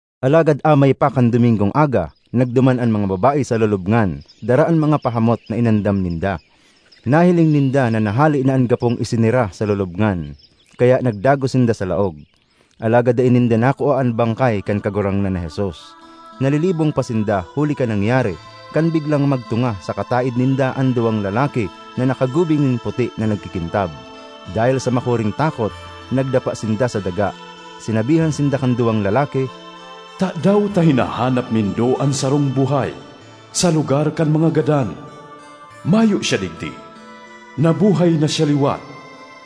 Alagad amay pa kan Domingong aga, nagduman an mga babae sa lulubngan, dara an mga pahamot na inandam ninda. Nahiling ninda na nahale na an gapong isenera sa lulubngan, kaya nagdagos sinda sa laog; alagad dai ninda nakua an bangkay kan Kagurangnan na Jesus. Nalilibong pa sinda huli kan nangyari, kan biglang magtunga sa kataed ninda an duwang lalaki na nakagubing nin puti na nagkikintab. Dahel sa makuring takot, nagdapa sinda sa daga. Sinabihan sinda kan duwang lalaki, “Tadaw ta hinahanap nindo an sarong buhay sa lugar kan mga gadan? Mayo siya digdi; nabuhay na siya liwat!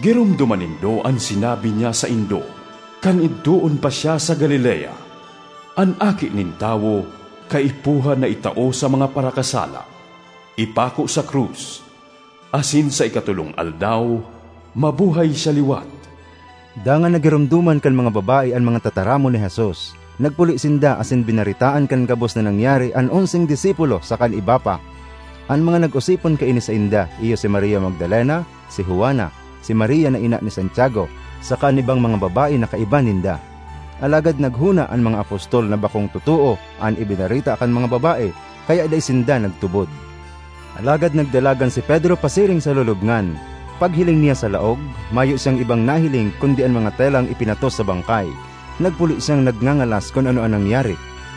Giromdoma nindo an sinabi niya saindo kan idtoon pa siya sa Galilea, ‘An Aki nin Tawo kaipuhan na itao sa mga parakasala, ipako sa krus asin sa ikatolong aldaw mabuhay siya liwat.’” Dangan nagiromdoman kan mga babae an mga tataramon ni Jesus. Nagpuli sinda asin binaretaan kan gabos na nangyari an onseng disipulo saka an iba pa. An mga nag-osipon kaini sainda iyo si Maria Magdalena, si Juana, si Maria na ina ni Santiago saka an ibang mga babae na kaiba ninda. Alagad naghona an mga apostol na bakong totoo an ibinareta kan mga babae, kaya dai sinda nagtubod. Alagad nagdalagan si Pedro pasiring sa lulubngan. Paghiling niya sa laog, mayo siyang ibang nahiling kundi an mga telang ipinatos sa bangkay. Nagpuli siyang nagngangalas kun ano an nangyari.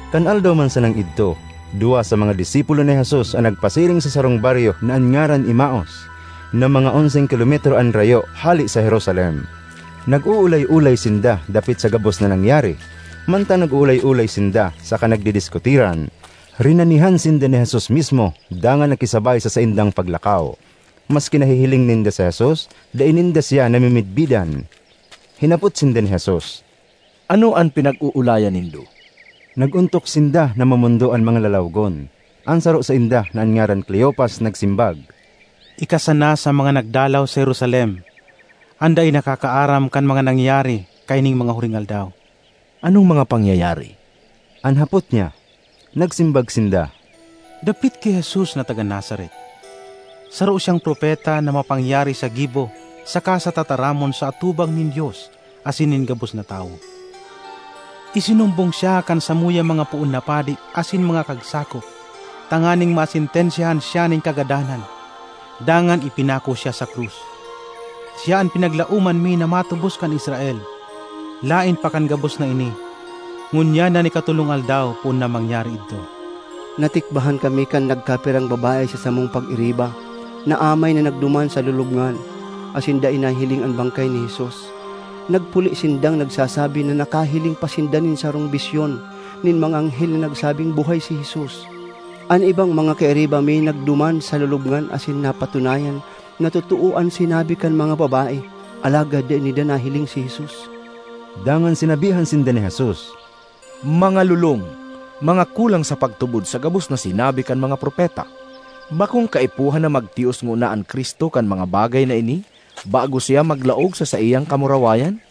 Kan aldaw man sanang idto, duwa sa mga disipulo ni Jesus an nagpasiring sa sarong baryo na an ngaran Emaus, na mga onseng kilometro an rayo hale sa Jerusalem. Nag-oolay-olay sinda dapit sa gabos na nangyari. Mantang nag-oolay-olay sinda saka nagdidiskutiran, rinanihan sinda ni Jesus mismo dangan nakisabay sa saindang paglakaw. Maski nahihiling ninda si Jesus, dai ninda siya namimidbidan. Hinapot sinda ni Jesus, “Ano an pinag-oolayan nindo?” Nag-ontok sinda na mamondo an mga lalawogon. An saro sainda, na an ngaran Cleofas, nagsimbag, “Ika sana sa mga nagdalaw sa Jerusalem an dai nakakaaram kan mga nangyari kaining mga huring aldaw.” ”Anong mga pangyayari?” an hapot niya. Nagsimbag sinda, “Dapit ki Jesus na taga Nazaret. Saro siyang propeta na mapangyari sa gibo saka sa tataramon sa atubang nin Dios asin nin gabos na tawo. Isinumbong siya kan samuyang mga poon na padi asin mga kagsakop tanganing masentensyahan siya nin kagadanan, dangan ipinako siya sa krus. Siya an pinaglaoman mi na matubos kan Israel. Laen pa kan gabos na ini, ngunyan an ikatolong aldaw poon na mangyari idto. Natikbahan kami kan nagkapirang babae sa samong pag-iriba na amay na nagduman sa lulubngan, asin dai nahiling an bangkay ni Jesus. Nagpuli sindang nagsasabi na nakahiling pa sinda nin sarong bisyon nin mga anghel na nagsabing buhay si Jesus. An ibang mga kairiba mi nagduman sa lulubngan asin napatunayan na totoo an sinabi kan mga babae, alagad dai ninda nahiling si Jesus.” Dangan sinabihan sinda ni Jesus, “Mga lolong! Mga kulang sa pagtubod sa gabos na sinabi kan mga propeta! Bakong kaipuhan na magtios ngona an Cristo kan mga bagay na ini bago siya maglaog sa saiyang kamurawayan?”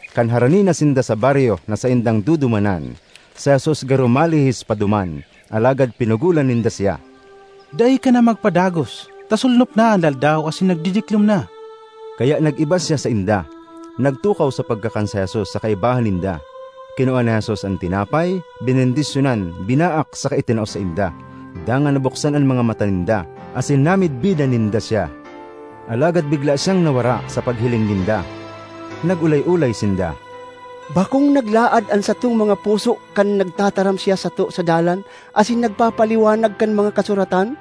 Kan harani na sinda sa baryo na saindang dudumanan, si Jesus garo malihis pa duman, alagad pinugolan ninda siya, “Dai ka na magpadagos ta solnop na an aldaw asin nagdidiklom na.” Kaya nag-iba siya sainda. Nagtukaw sa pagkakan si Jesus sa kaibahan ninda; kinua ni Jesus an tinapay, benendisyonan, binaak saka itinao sainda. Dangan nabuksan an mga mata ninda, asin namidbidan ninda siya; alagad bigla siyang nawara sa panghiling ninda. Nag-olay-olay sinda, “Bakong naglaad an satong mga puso kan nagtataram siya sato sa dalan asin nagpapaliwanag kan mga kasuratan?”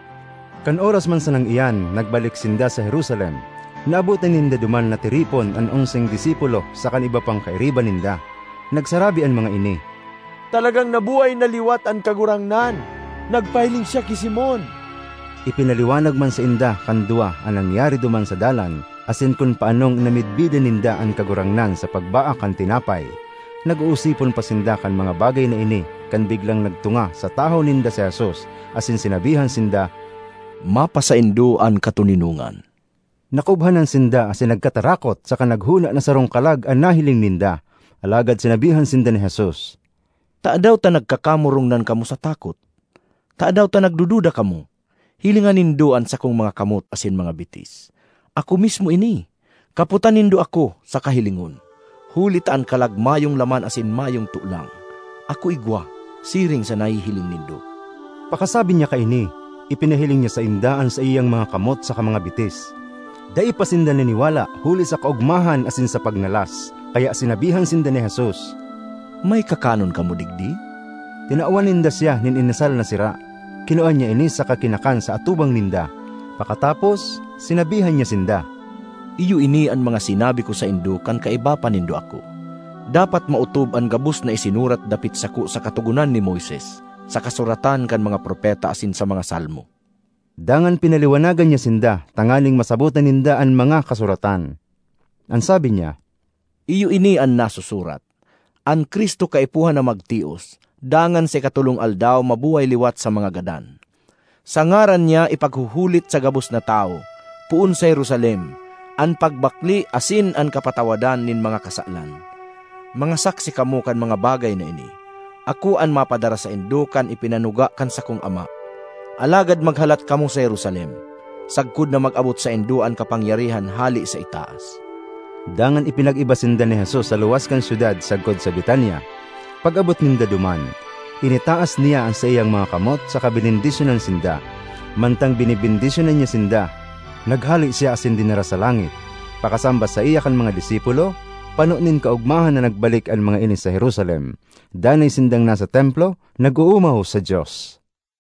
Kan oras man sanang iyan nagbalik sinda sa Jerusalem. Naabotan ninda duman na tiripon an onseng disipulo saka an iba pang kairiba ninda. Nagsarabi an mga ini, “Talagang nabuhay na liwat an Kagurangnan! Nagpahiling siya ki Simon!” Ipinaliwanag man sainda kan duwa an nangyari duman sa dalan, asin kun paanong namidbidan ninda an Kagurangnan sa pagbaak kan tinapay. Nag-oosipon pa sinda kan mga bagay na ini, kan biglang nagtunga sa tahaw ninda si Jesus. Asin sinabihan sinda, “Mapasaindo an katoninongan.” Nakubhanan sinda asin nagkatarakot saka naghona na sarong kalag an nahiling ninda. Alagad sinabihan sinda ni Jesus, “Tadaw ta nagkakamurongnan kamo sa takot? Tadaw ta nagdududa kamo? Hilinga nindo an sakong mga kamot asin mga bitis. Ako mismo ini! Kapotan nindo ako saka hilingon; huli ta an kalag mayong laman asin mayong tolang. Ako igwa, siring sa nahihiling nindo.” Pakasabi niya kaini, ipinahiling niya sainda an saiyang mga kamot saka mga bitis. Dai pa sinda naniwala huli sa kaogmahan asin sa pagngalas, kaya sinabihan sinda ni Jesus, “May kakanon kamo digdi?” Tinawan ninda siya nin inasal na sira; kinua niya ini saka kinakan sa atubang ninda. Pakatapos, sinabihan niya sinda, “Iyo ini an mga sinabi ko saindo kan kaiba pa nindo ako: dapat maotob an gabos na isinurat dapit sako sa Katogonan ni Moises, sa kasuratan kan mga propeta asin sa mga Salmo.” Dangan pinaliwanagan niya sinda tanganing masabotan ninda an mga kasuratan. An sabi niya, “Iyo ini an nasusurat: an Cristo kaipuhan na magtios, dangan sa ikatolong aldaw mabuhay liwat sa mga gadan; sa ngaran niya ipaghuhulit sa gabos na tawo, poon sa Jerusalem, an pagbakle asin an kapatawadan nin mga kasalan. Mga saksi kamo kan mga bagay na ini. Ako an mapadara saindo kan ipinanuga kan sakong Ama. Alagad maghalat kamo sa Jerusalem, sagkod na mag-abot saindo an kapangyarihan hale sa itaas.” Dangan ipinag-iba sinda ni Jesus sa luwas kan syudad sagkod sa Betania. Pag-abot ninda duman, initaas niya an saiyang mga kamot saka benendisyonan sinda. Mantang benebendisyonan niya sinda, naghale siya asin dinara sa langit. Pakasamba saiya kan mga disipulo, pano nin kaogmahan na nagbalik an mga ini sa Jerusalem. Danay sindang nasa Templo, nag-oomaw sa Dios.